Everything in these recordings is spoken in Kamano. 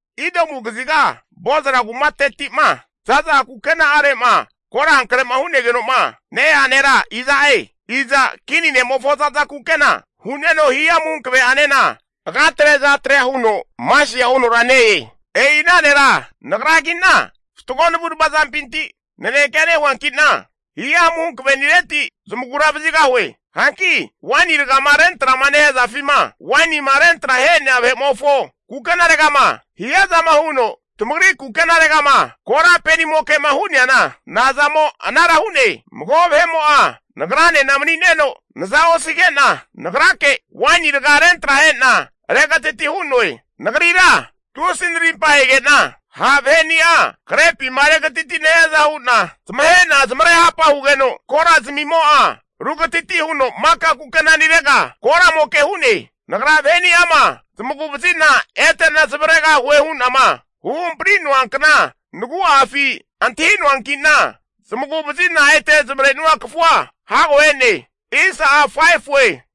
Idomu kaziga Bozra kumateti'ma za'za kukena'are'ma korankrema hunegeno'ma ne-ea nera iza'e? Iza kini ne'mofo za'za kukena hu'neno hihamu hankaveanena agatre azatrea huno masia hunora ne-e? E'i ana nera Nagragi'na fatgo navu'nava zampinti nanekea nehuanki'na hihamu hankavenireti zamagura vazigahue. Hanki waini rgama rentra'ma nehazafima wainima rentra ahe'nea vahe'mofo kukenaregama hiazama huno, tamagri kukenaregama kora penimoke'ma hu'neana nazamo anara hu'ne? Mago vahe'mo'a nagranena mani'neno naza osige'na nagrake waini raga rentra ahe'na regatati hu'noe. Nagrira tusi'a narimpa ahege'na ha' vaheni'a krepima regatiti'ma nehiaza hu'na zamahe'na zamarehapa hugeno, kora zamimo'a rugatati huno maka kukenanirega koramoke hu'ne. Nagra vaheni'ama zamagu vazi'na ete'na zamavaregahue hu'nama huhampari'noa kna nagu'afi antahinoankina, zamagu vazi'na ete zmavrenua kafua hago e'ne.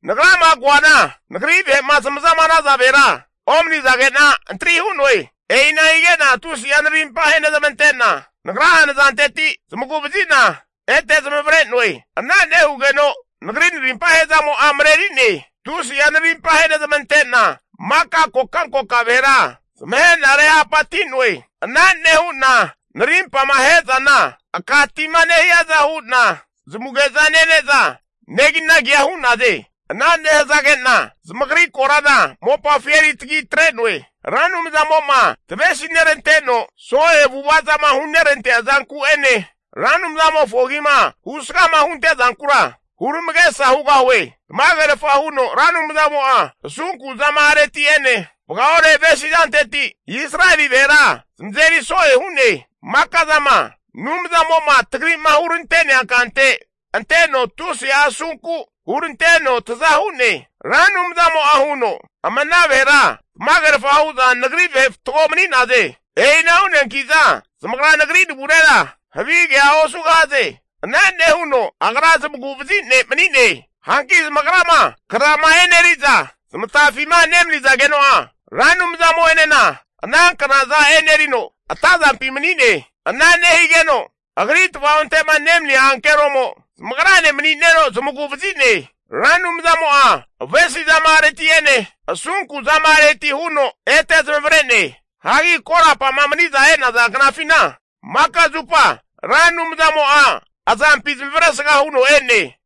Nagrama koana Nagri vahe'ma zamazama hanaza vahera omani'zagena antri hu'noe. E'ina hige'na tusi'a narimpa ahenezmante'na Nagra'a nazanteti zamagu vazi'na ete zamavare'noe. Ana nehugeno Nagri narimpa ahezamo'a mareri'ne. Tusi'a narimpa ahenezmante'na maka kokankoka vahera zamahe'na rehapati'noe. Ana nehu'na narimpama ahe'zana aka tima nehiaza hu'na zamuge'za nene'za neginagia hu'naze. Ana nehazage'na zamagri korana mopafi eri tagi atre'noe. Ra Anumzamo'ma tavesi neranteno so'e avu'avazama hunerantea zanku'ene Ra Anumzamofo agima husgama hunte'zankura huramagesa hugahue. Tamagerfa huno Ra Anumzamo'a asunku zama-areti'ene vagaore avesi zanteti Israeli vahera zamazeri so'e hu'ne. Maka'zama Anumzamo'ma tagri'ma hurante'nea kante anteno tusi'a asunku huranteno taza hu'ne. Ra Anumzamo'a huno, Ama ana vahera tamagerfa hu'za Nagri vahe fatgo mani'naze. E'ina hu'neanki'za zamagra nagri navurera havi kea osugahaze. Ana nehuno Agra zamagu'vazi ne' mani'ne. Hanki zamagrama knazama eneri'za zamatafima nemani'zageno'a, Ra Anumzamo'enena ana knaza enerino, atazampi mani'ne. Ana nehigeno Agri tavaonte'ma nemania ankeromo zamagrane mani'neno zamagu vazi'ne. Ra Anumzamo'a avesizama'areti'ene asunku zama'areti huno ete zamavare'ne. Hagi korapa'ma mani'za e'naza knafina, maka zupa Ra Anumzamo'a azampi zamavaresga huno e'ne.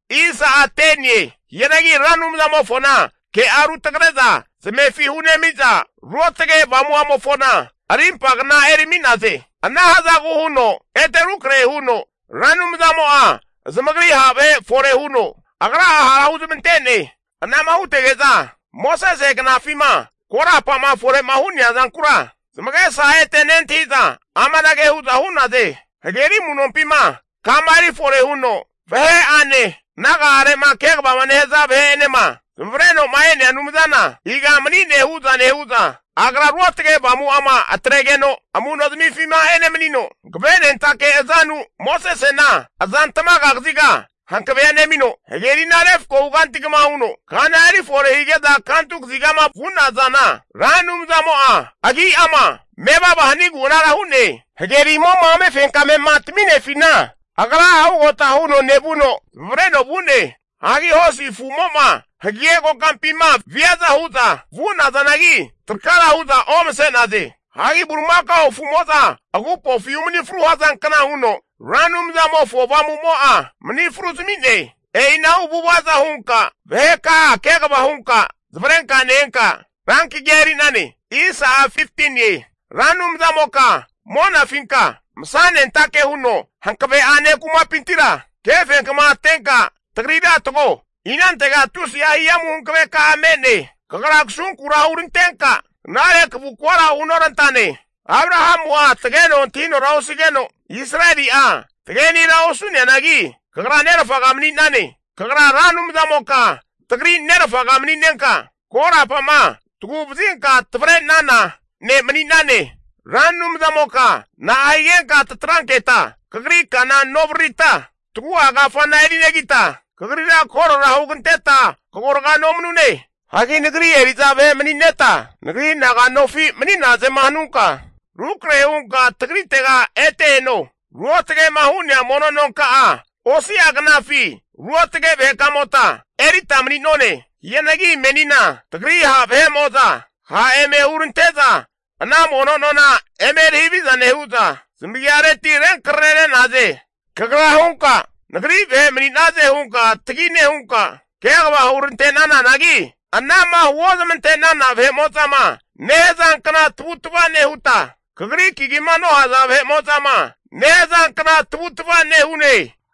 Hianagi Ra Anumzamofona ke'a rutagre'za zamefi hunemi'za Ruotage Avamu'amofona arimpagna erimi'naze. Ana hazagu huno ete rukrahe huno Ra Anumzamo'a zamagri ha' vahe fore huno Agra'a hara huzmante'ne. Anama hutege'za Mosese knafima korapa'ma fore'ma hu'nea zankura zamagesa ete nentahi'za amanage hu'za hu'naze. Hageri amu'nompima kama erifore huno vahe'ane naga'are'ma kegavama nehaza vahe'enema zamavareno'ma e'nea Anumzana iga mani'ne hu'za nehu'za, Agra Ruotage Avamu'ama atregeno amunozamifima enemanino, hankavenentake azanu Mosesena azantamaga kaziga hankavea nemino, hagerina refkohu kanti kama huno kana erifore hige'za kantu kazigama vu'nazana, Ra Anumzamo'a agri agimo'ma agi'ama mevava hanigu anara hu'ne. Hagerimo'ma amefenkame'ma tami'nefina agra'a ugota huno nevuno zamavareno vu'ne. Hagi hosi afumo'za hagege kokampima viaza hu'za vu'nazanagi, trakara hu'za omase'naze. Hagi bulimakao afumo'za agupofi umani fru hazankna huno, Ra Anumzamofo Avamumo'a mani fru zami'ne. E'inahu avu'avaza hunka vaheka'a kegava hunka zamavarenka ne-enka Rankagia eri'nane. Ra Anumzamoka monafinka masanentake huno hankave'ane kumapintira, kefenkma atenka tagrira tago. Inantega tusia hihamu hankaveka'a me'ne? Kagra kasunkura hurantenka knare kavukvara hunorantane. Abrahamu'a tageno antinora osigeno, Israeli'a tagenira osu'neanagi, kagra nerfaga mani'nane. Kagra Ra Anumzamoka tagri nerfaga mani'nenka, korapama tagu'vazinka tavre'nana ne' mani'nane. Ra Anumzamoka na'a higenka tatranketa kagri kana novaririta, tagu'a kafana erinegita, kagrira korora huganteta kagorga nomanune? Hagi nagri eri'za vahe mani'neta, Nagri naganofi mani'nazema hanunka, rukrahe hunka tagritega ete eno. Ruotage'ma hu'nea mono nonka'a osi'a knafi ruotge vahekamota erita mani'nonane. Hianagi menina tagri ha' vahe'mo'za ha' eme huranteza ana mono nona eme eri haviza nehu'za, zamagiareti renkrare re'naze. Kagra hunka nagri vahe mani'naze hunka tagi nehunka kegava hurante'nananagi, ana'ma huozmante'nana vahe'mo'zama nehazankna tavutava nehuta, kagri kagima nohaza vahe'mo'za nehazankna tavutava nehu'ne.